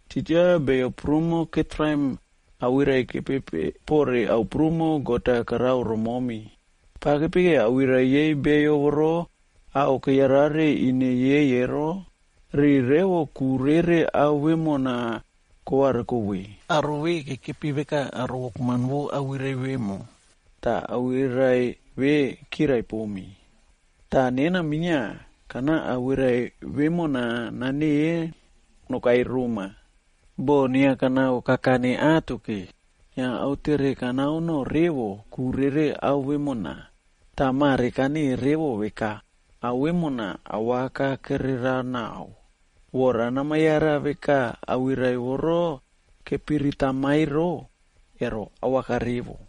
titja beyo prumo ketraim awirai-a kepepeꞌe pore ao prumo God-a karao romomi. Pa kepekeo awirai yei beyo voro ao keyarare ine yei ero, riu revo ku rere ao vemona kovariko ve. Aro ve kekepi veka aro wokman vo awirai vemo, tah awirai ve kirai pomi. Tah nena minia, kana awirai vemona naneꞌe nokai roma. Boꞌo inia kanao kakane atoke, inia autere kanao noꞌo revo ku rere ao vemona. Tah mare kaneꞌe revo veka, ao vemona awaka kererao naꞌao. Vora nama yara veka awirai voro kepiritama ero, ero awaka revo.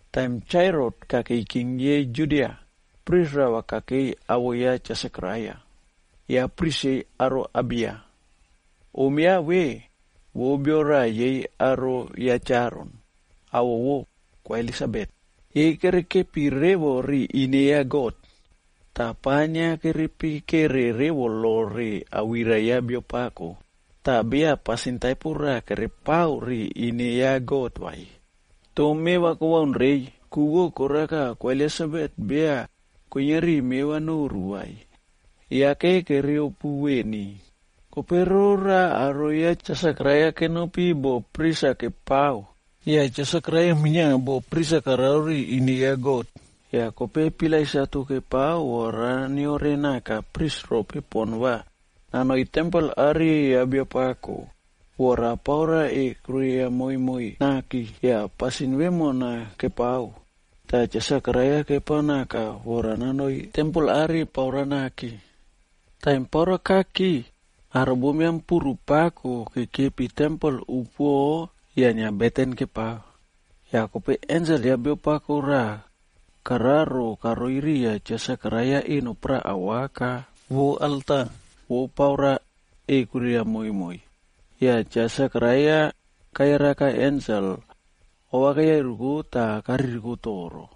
Taim Cha Herotb kakei king yei Judia, pris rava kakei awoꞌo ya Cha Sekaraia. Ya pris yei aro Abiya.c Om ya ve, vo bio raꞌa yei aro ya Cha Aron,d awoꞌo vo Kwa Elisabet. Yei kerekepi revo ri ine ya God. Tah pa inia kere pikere revo lo re awirai ya Biapako, tah beya pasin taipo raꞌa kerepao ri ine ya God vai. Toh meva kobaun reiy, ku vo koraka Kwa Elisabet beya kuiniari me va noru vai. Yake kereopu veni. Kope roraꞌa aro ya Cha Sekaraia kenopi boꞌo pris-a nepao,e yah Cha Sekaraia minia boꞌo pris-a karao ri ine ya God. Yah kope pilai satu kepao vora neore naka pris rope pon va nanoi tempel are ya Biapako, vora paura ekwiria momoi naki. Yah pasin vemona kepao, tah Cha Sekaraia kepao naka vora nanoi tempel are paura naki. Taim paura kaki, aro bombiam puru pako kekepi tempel upuoꞌo yah inia beten-a kepao. Yah kope ensel ya Biapako raꞌa kararo karoi riya Cha Sekaraia eno paraꞌa awaka vo alta vo paura ekwiria momoi. Yah Cha Sekaraia kayaraka ensel, ova keyairuko tah kaririko toro.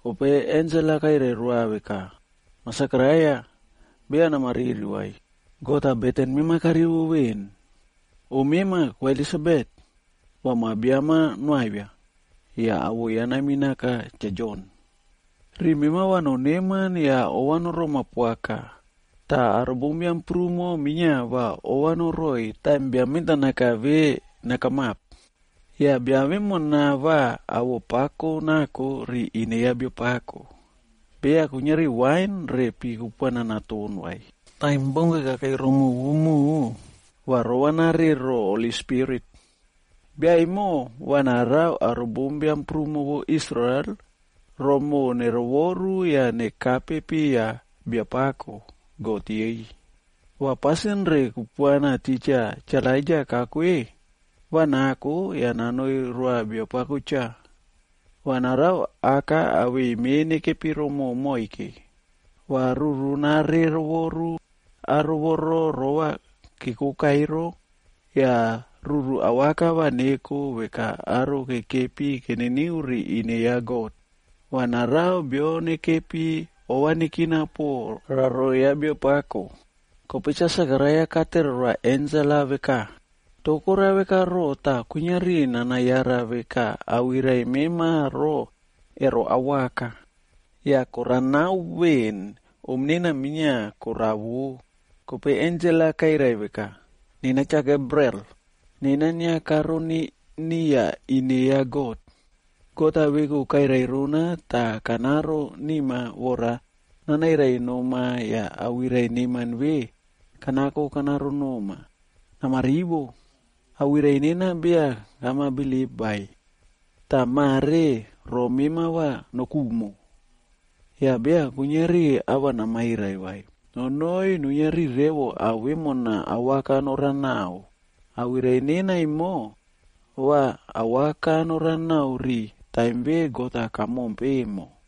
Kope ensel-a kairai roa veka, “Mah Sekaraia, beya nama riri vai, God-a beten mema karivo veꞌen. Om mema Kwa Elisabet, va ma biam-a noavia, yah awoꞌo ya naminaka Cha Jon. Riꞌi mema va noneman yah ova noroma poaka. Tah aro bombiam prumo minia va ova noroꞌoiy taim bia mentanaka ve nakamap. Yah bia vemo va awoꞌo pako nako ri ine ya Biapako. Beya kuiniari wain re pi kupuana naton vai. Taim baunke kakei romoꞌo vo moꞌo, va rova nare ro Holi Spirit. Bia emo va narao aro bombiam prumo vo Israel romoꞌo nerovoru yah nekape piya Biapako, God yei. Va pasin re kupuana titja Cha Elaija kako-e, va nako yah nanoi roa Biapako cha. Va narao aka awei me nekepi romoꞌo moike. Va ruru nare rovoru aro voro rova kekoka ero, yah ruru awaka va neko veka aro kekepi keniniu ri ine ya God. Va narao bio nekepi ova nekina po raro ya Biapako.” Kope Cha Sekaraia katere roa ensel-a veka, “Toh korao veka roꞌo tah kuiniari nana yara veka awirai mema ro, ero awaka? Yah koranao veꞌen, om nena minia yah koravo.” Kope ensel-a kairai veka, “Nena Cha Gabriel, nena inia karoni niya ine ya God. God-a veku kairai rona tah kanaro nima vora nanairai noma yah awirai neman ve kanako kanaro noma. Nama rivo! Awirai nena beya kama bilip vai, tah mare ro mema va nokumo. Yah beya kuiniari ava namairai vai, nonoi nuiniari revo ao vemona awaka norao naꞌao. Awirai nena emo, va awaka noranao ri taim ve God-a kamompe emo.”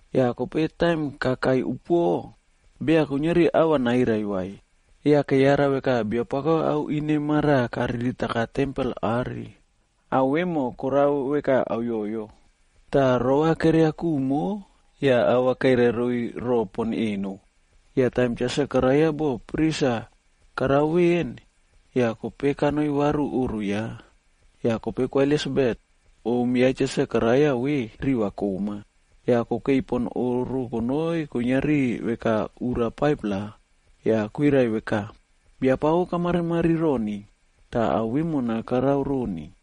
Yah kope taim kakai upuoꞌo, beya kuiniari ava nairai vai. Yah keyara veka Biapako ao ine maraꞌa kariritaka tempel are, ao vemo korao veka auyoyo. Tah rova keria kumo yah ava kairai roiy roꞌo pon eno. Yah taim Cha Sekaraia boꞌo pris ya karao veꞌen, yah kope kanoi varu oꞌro ya. Yah kope Kwa Elisabet, om ya Cha Sekaraia ve, riva koꞌma. Yah kokei pon oꞌro konoi kuiniari veka ura 5-pla, yah kwirai veka, “Biapako kamarimari roni tah ao vemona karao roni,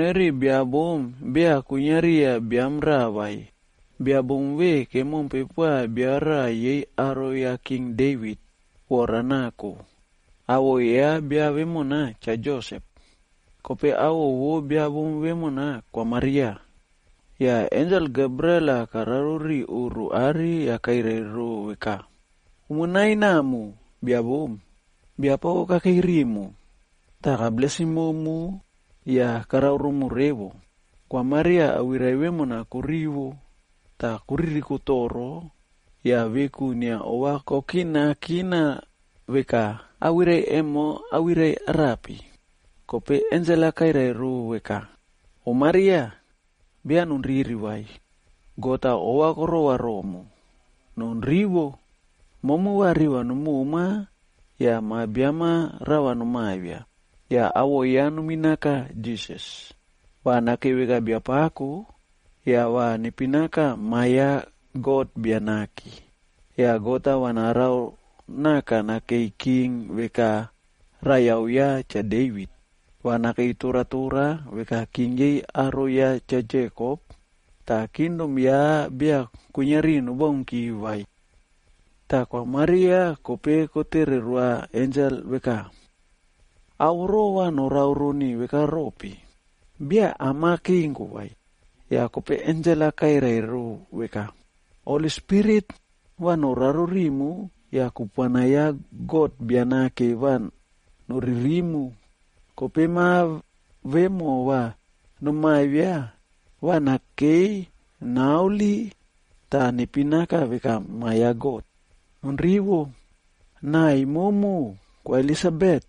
Kanoi ri bia bom raꞌa beya kwinia riya biam raꞌa vai. Bia bom ve kemompe poa bio raꞌa yei aro ya King Devit vora nako. Awoꞌo ya bia vemona, Cha Josep. Kope awoꞌo vo bia bom vemona, Kwa Maria. Yah ensel Gabriel-a kararo ri oꞌro are yah kairai ro veka, “Umo nai namu, bia bom. Biapako kakei rimu, tah kablesim momu yah karao romu revo.” Kwa Maria awirai vemona korivo, tah koririko toro yah veku inia ova kokinakina veka, “Awirai emo awirai arape?” Kope ensel-a kairai rou veka, “Om Maria, beya nonriri vai. God-a ova korova romu. Non rivo! Momu va riva nomoma yah ma biam-a rava nomawia. Yah awoꞌo ya nominaka Jisas. Va nakei veka biapako, yah va nepinaka Ma ya God Bia Nake. Yah God-a va narao naka nakei king veka raiyao ya, Cha Devit. Va nakei toratora veka king yei aro ya Cha Jekop, tah kingdom ya beya kuiniari nobaunki vai.” Tah Kwa Maria kope kotere roa ensel veka, “Ao voro va norao roni veka rope? Beya am-a kenko vai.” Yah kope ensel-a kairai rou veka, “Holi Spirit va noraro rimu yah kupuana ya God Bia Nake va noririmu. Kope ma vemo va nomawia, va nakei naholi, tah nepinaka veka Ma ya God. Non rivo. Naꞌai momu Kwa Elisabet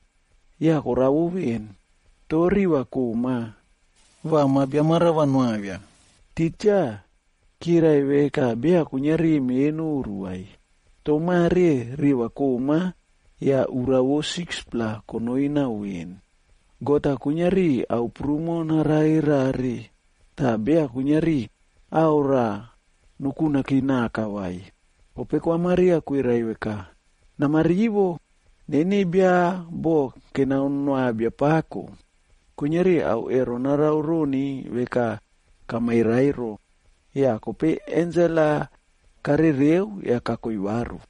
yah koravo ven, toh riꞌi va koꞌma va ma biam-a rava noavia. Titja kirai veka beya kuiniari me noru vai. Tah mare riva koꞌma yah ura 6-pla konoi naꞌao veꞌen. God-a kuiniari ao prumo narare rare, tah beya kuiniari ava raꞌa nokunaki naka vai.” Kope Kwa Maria kwirai veka, “Nama rivo. Neni bia boꞌo kenao noa Biapako, kuiniari ao ero narao roni veka kamairai ero.” Yah kope ensel-a karereu yah kakoi varu.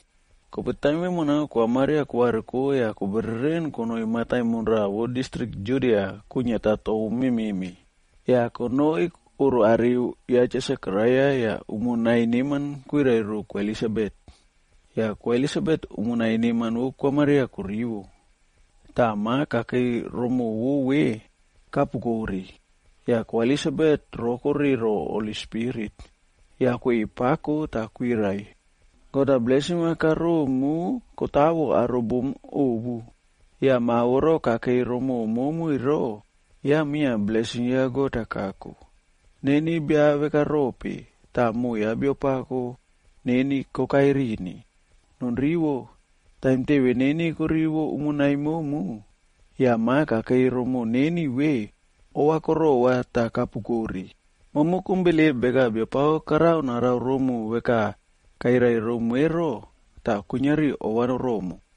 Kope taim vemona Kwa Maria kovariko yah kobereren konoi mataimon raꞌa vo distrik Judia kwiniata tou memeꞌme. Yah konoi oꞌro are ya Cha Sekaraia yah umo nai neman kwirai ro Kwa Elisabet. Yah Kwa Elisabet umo nai neman vo Kwa Maria korivo, tah ma kakei rimoꞌo vo ve, kapukore. Yah Kwa Elisabet rokore ro Holi Spirit, yah kweꞌei pako tah kwirai, “God-a blesim-a karomu kotawo aro bom ovu. Yah ma voro kakei rimoꞌo momu ero, ya minia Blesim ya God-a kako. Neni bia veka rope, tah moꞌo ya Biapako neni kokai rini? Non rivo. Taim teve neni korivo umo nai momu, yah ma kakei rimoꞌo neni ve, ova korova tah kapukore. Momu kom bilip veka Biapako karao narao romu veka kairai romu ero, tah kuiniari ova noromu.”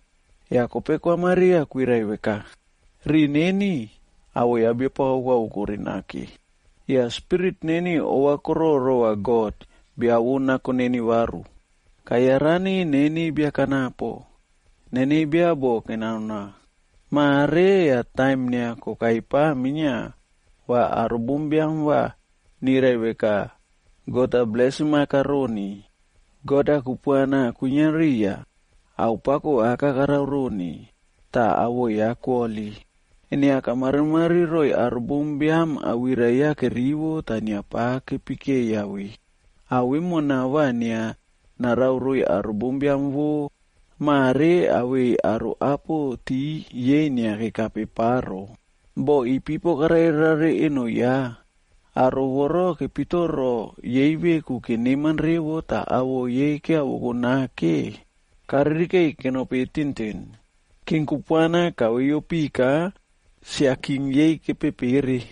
Yah kope Kwa Maria kwirai veka, “Riꞌi neni, awoꞌo ya Biapako koavokore nake. Yah spirit neni ova koroꞌo rova God, bia vo nako neni varu. Kayarani neni bia kanapo, neni bia boꞌo ya kenao. Mare yah taim inia kokai pa minia va aro bombiam va nirai veka God-a blesim-a karoni. God-a kupuana kwinia riya, ao pako aka karao roni, tah awoꞌo ya koholi. Inia kamarimari roiy aro bombiam awirai ya kerivo tah inia pa kepikeiya ve. Ao vemona va inia narao roiy aro bombiam vo mare awei aro apo ti yei inia kekape pa ro. Boꞌo ipipo karare rare eno ya. Aro voro kepitoro yei veku keneman revo tah awoꞌo yei kiavoko nake, karirikeꞌiy kenopi tintin. King kupuana kaveiyo pika yah sia king yei kepepere,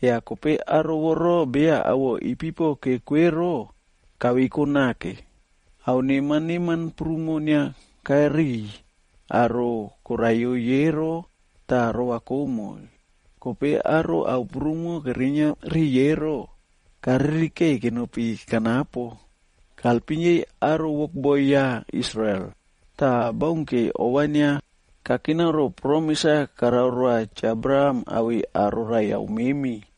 yah kope aro voro beya awoꞌo ipipo keko ero, kaveiko nake. Ao neman neman prumo inia kariꞌiy aro koraiyoiy ero, tah rova komoiy. Kope aro ao prumo kerinia riꞌiy ero, karirikeꞌeiy kenopi kanapo. Kalpim yei aro wokboi ya Israel, tah baunke ova inia kakina ro promis-a karao roa Cha Abraham awei aro raiyau memi,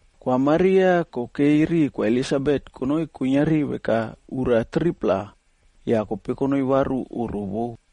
Kwa Maria kokei ri Kwa Elisabet konoi kuiniari veka ura 3-pla, yah kope konoi varu oꞌro vo.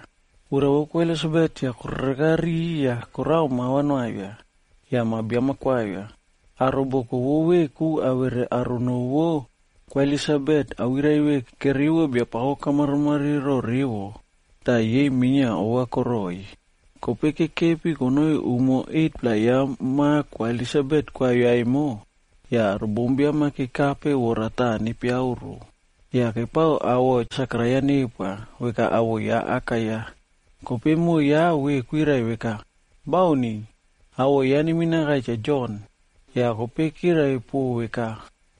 Ura vo Kwa Elisabet yah korereka ri yah korao mava noavia, yah ma biam-a koavia. Aro boko vo veku awere aro noo vo Kwa Elisabet awirai ve kerivo Biapako kamarimari roꞌo revo, tah yei minia ova koroꞌoiy. Kope kekepi konoi umo 8-pla ya ma Kwa Elisabet koavia emo, yah aro bombiam-a kekape vora taꞌa nepiauro. Yah kepao awoꞌo Sekaraia nepoa, veka awoꞌo ya aka ya. Kope moꞌo ya ma ve kwirai veka, “Bauni. Awoꞌo ya va neminaka Cha Jon.” Yah kope kirai po veka,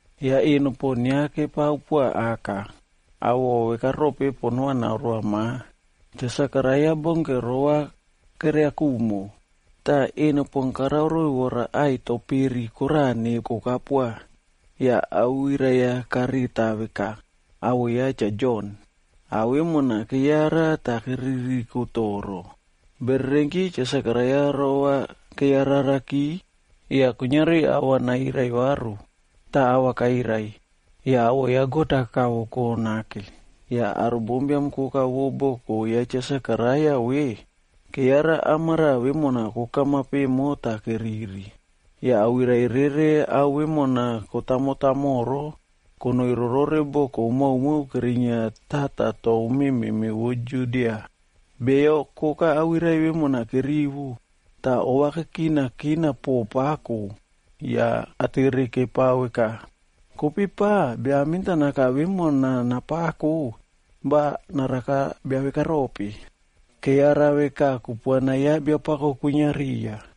Yah eno pon inia kepao poa aka, awoꞌo veka rope pon karao naoroa ma. Cha Sekaraia baunke rova keria kumo, tah eno pon karao roiy vora ai to peri koraꞌa nekoka poa. Yah awirai-a kareta veka, “Awoꞌo ya Cha Jon.” Yah ao vemona keyara tah keririko toro. Bererenki, Cha Sekaraia rova keyararaki, yah kuiniari ava nairai varu. Tah ava kairai, yah awoꞌo ya God-a kavoko nake. Yah aro bombiam koka vo boko ya Cha Sekaraia ve, keyara amaraꞌa vemona kokamap emo tah keriri. Yah awirai rere ao vemona kotamo tamoro konoi rorore boko maomao kerinia tata tou memeꞌme vo Judia. Beyo koka awirai vemona kerivo, tah ova kekinakina poꞌo pako yah atere kepao veka, “Kope pa, bia mentanaka vemona napako va naraka bia vekarope?” Keyara veka kupuana ya Biapako kwinia riya.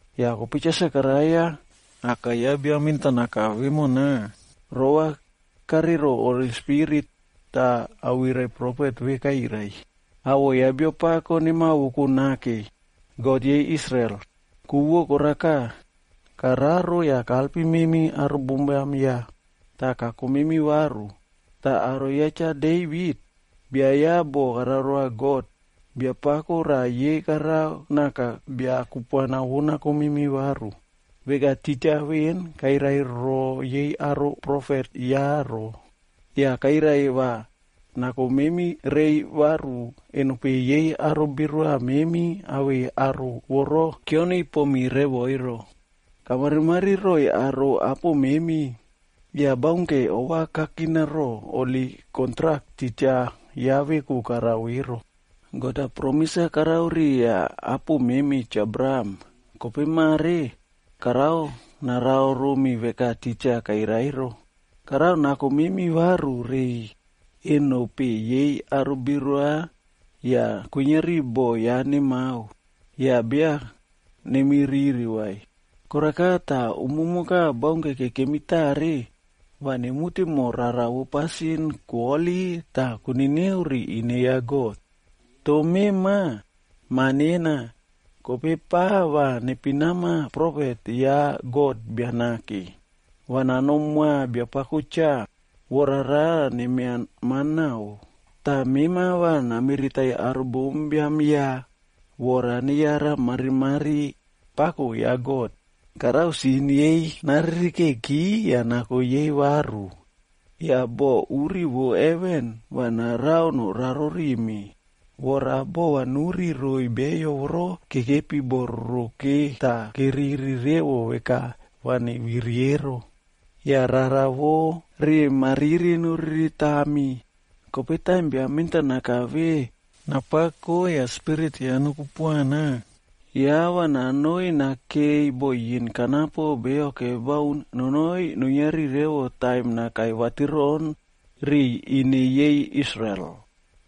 Yah kope Cha Sekaraia, aka ya bia mentanaka vemona, rova kare roꞌo Holi Spirit, tah awirai profet ve kairai, “Awoꞌo ya Biapako nemawoko nake, God yei Israel. Ku vo koraka, kararo yah kalpim memi aro bombiam ya, tah kako memi varu. Tah aro ya Cha Devit, bia ya boꞌo karao roa God, Biapako raꞌa yei karao naka bia kupuana vo nako memi varu, veka titja kairai veꞌen roo yei holi profet ya. Kairai va nako memi rei varu aro ine kepimitroputropu awei aro voro beya keperepomi revo ero. Kamarimari roꞌoiy aro apo memi, yah baunke ova kakina roꞌo holi kontrak titja ya veku karao ero. God-a promis-a karao riya apo memi Cha Abraham. Kope mare, karao narao romi veka titja kairai ero. Karao nako memi varu reiy eno peꞌe yei aro birua yah kuiniari boꞌo ya nemao, yah beya nemi riri vai. Koraka tah umumoka baunke kekemi tare, va nemute moho rara vo pasin koholi tah koniniu ri ine ya God. Toh mema, ma nena, kope pa va nepinama profet ya God Bia Nake. Va nanom moa Biapako cha, vora rara nemia manao. Tah mema va namiritaiy aro bombiam ya, vora neyara marimari pako ya God. Karao sin yei naririkeki yah nako yei varu. Yah bo uri vo heven va narao noraro rimi, vora bova nuri roiy beyo voro kekepi bo roroke tah keriri revo veka va neviri ero, yah rara vo riꞌi mariri noriritami.” Kope taim bia mentanaka ve napako yah spirit ya nokupuana, yah va nanoi nakei bo yin kanapo beyo kebaun nonoi nuiniari revo taim nakai vatiroꞌon riꞌiy ine yei Israel.